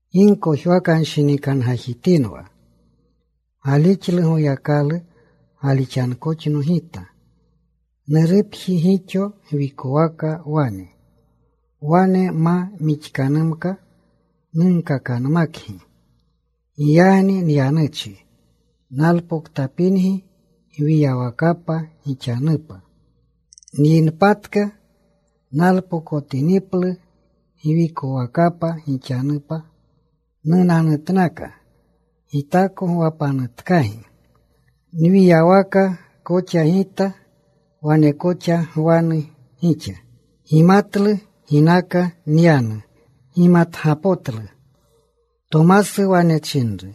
“Gi gkojwakanshinikangajitinwa. Galixlu Goyakalu. Galixankoxno Gita. Nurupji gixo gwikwaka wane. Wane ma mixkanumka, nunkakanmakgi. Giyagni nyanuchi. Nalpoktapingi gwiyawakapa gixanupa. Nyinpatka, nalpokotiniplu gwikowakapa gixanupa, nunanutnaka. Gitako gwapanutkagi. Nwiyawaka koxa Gita, wane koxa gwanu gixa. Gimatlu ginaka nyanu. Gimatgapotlu.” Tomasu wane chinru,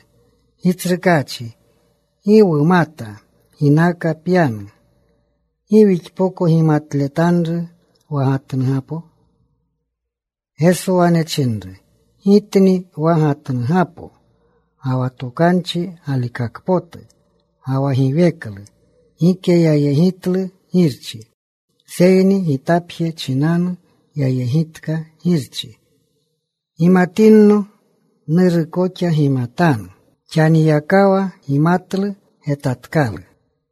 “Gitsrukaachi, gi wumata ginaka pyanu. ¿Gi wixpoko gimatletanru wa gatnugapo?” Geso wane chinru, “Gitni wa gatnugapo, ga wa tokanchi galikakpotu, ga wa giweklu. Gike yayegitlu Girchi, seyni Gitapje chinanu yayegitka Girchi. Gimatinno, Nuru koxa gimatanu. Xaniyakawa gimatlu. Getatkalu.”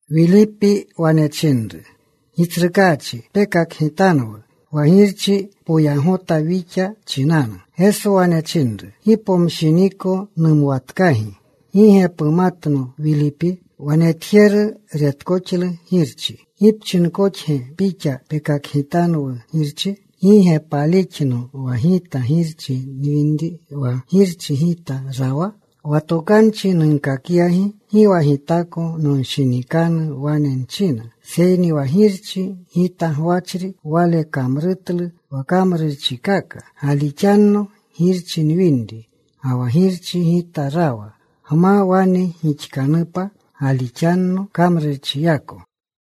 Wilipi wane chinru, “Gitsrukaachi, pekakgitanwu wa Girchi. Poyagota wixa chinanu.” Geso wane chinru, “Gi pomshiniko numwatkagi, ¿gi ge pumatno, Wilipi? Wa netjeru retkoxlu Girchi. ¿Gi pchinkoxge pixa, ‘Pekakgitanwu Girchi?’ ¿Gi ge palixno wa Gita Girchi nwinri, ga wa Girchi Gita rawa? Wa tokanchi nunkakyagi, gi wa Gitako nonshinikanu wane nchina. Seyni wa Girchi Gita gwachri Wale kamrutlu wa kamrurchikaka. Galixanno Girchi nwinri, ga wa Girchi Gita rawa. Gma wane gixkanupa, galixanno kamrurchiyako.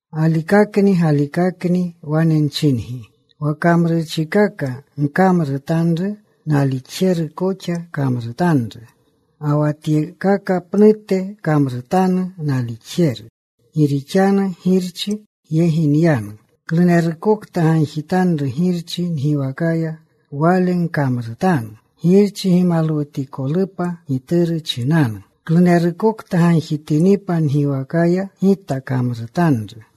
“Galikakni, galikakni wane nchingi, wa kamrurchikaka nkamrutanru nalixjeru koxa kamrutanru. Ga wa tyekaka pnute kamrutanu nalixjeru, gi rixanu Girchi yegi nyanu. Klunerukokta gagjitanru Girchi ngiwakaya, wale nkamrutanu, Girchi gimalwutikolupa Gituru chinanu. Klunerukokta gagjitinipa ngiwakaya, Gita kamrutanru.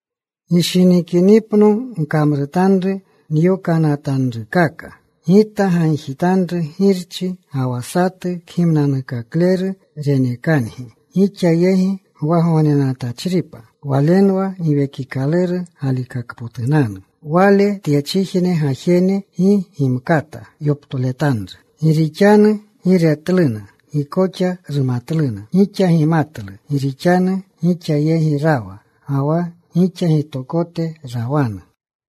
“Gishinikinipno gkamrutanru nyokanatanrukaka. Gita gagjitanru Girchi ga wa satu Kgimnanukakleru renekangi, gixa yegi gwagognenatachripa. Walenwa Giwekikaluru galikakpotunanu. Wale tyechijne gajene gi gimkata yoptoletanru, gi rixanu gi retluna. Gi koxa rumatluna. Gixa gimatlu gi rixanu gixa yegi rawa, ga wa gixa gitokote rawanu.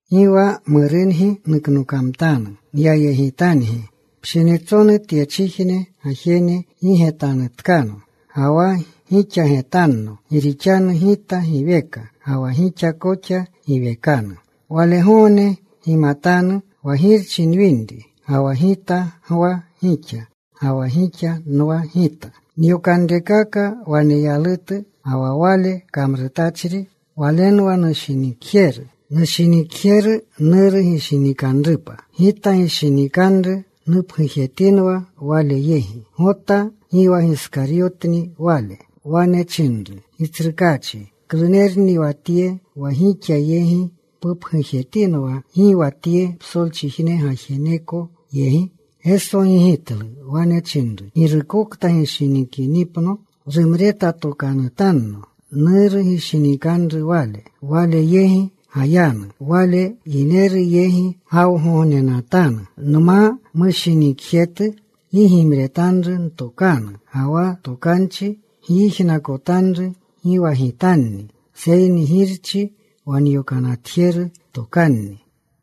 “Gi wa murungi nuknokamtanu. Nyayegitangi. Pshinitsonu tyechijne gajene gi getanutkano, ga wa gixa getanno, gi rixanu Gita giweka, ga wa gixa koxa giwekanu. Walegogne gimatanu wa Girchi nwinri, ga wa Gita gwa gixa, ga wa gixa nwa Gita. Nyokanrekaka waneyalutu, ga wa wale kamrutachri, walenwa nushinikjeru. Nushinikjeru Nuru gishinikanrupa. Gita gishinikanru. Nupgujetinwa wale yegi.” Gota gi wa Giskaryotni wale, wane chinru, “Gitsrukaachi, ¿klunerni wa tye wa wixa yegi pupgujetinwa, gi wa tye psolchijne gajeneko yegi?” Geso gigitlu. Wane chinru, “Girukokta gishinikinipno rumretatokanutanno. Nuru gishinikanru wale. Wale yegi gayanu. Wale yineru yegi gawgognenatanu. Nma mushinikjetu gi gimretanru ntokanu. Ga wa tokanchi gyijnakotanru gi wa Gitanni, seyni Girchi wa nyokanatjeru tokanni.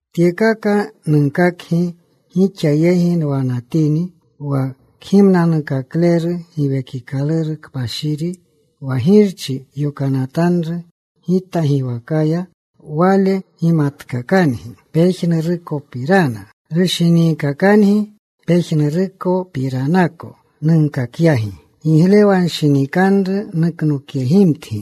“Tyekaka nunkakgi gixa yegi nwanatini. Wa Kgimnanukakleru, Giwekikaluru Kpashiri, wa Girchi yokanatanru Gita giwakaya, Wale gimatkakangi pejnurukopirana. Rushiniikakangi pejnurupiranako nunkakyagi. Giglewanshinikanru nuknokyegimtgi.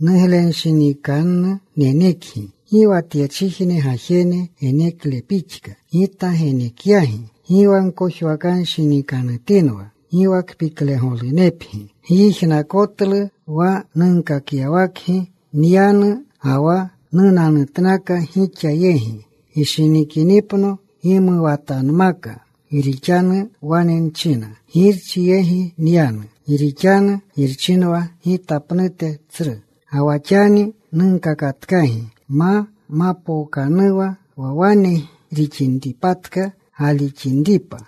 Nuglenunshinikanu nenekgi. Gi wa tyechijne gajene genekle pixka, Gita genekyagi. Gi wa gkojwakanshinikanutinwa. Gi wa kpiklegolunepgi. “Gyijnakotlu wa nunkakyawakgi: ‘Nyanu, ga wa nunanutnaka gixa yegi.’ Gishinikinipno, gimuwatanmaka, gi rixanu wane nchina, Girchi yegi nyanu. Gi rixanu Girchinwa Gita pnute tsru. Ga wa xani nunkakatkagi ma mapookanuwa, wa wane rixinpatka galixinripa.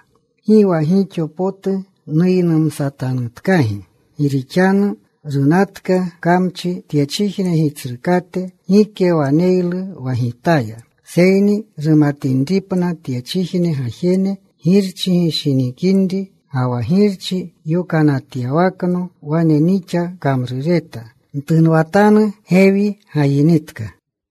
Gi wa gixo potu nuynumsatanutkagi, gi rixanu runatka kamchi, tyechijne gitsrukate. Gike waneylu wa Gitaya. Seyni rumatinripna tyechijne gajene Girchi nushinikinri, ga wa Girchi yokanatyawakno wane nixa kamrureta. “Ntunwatanu. Gewi gayinitka.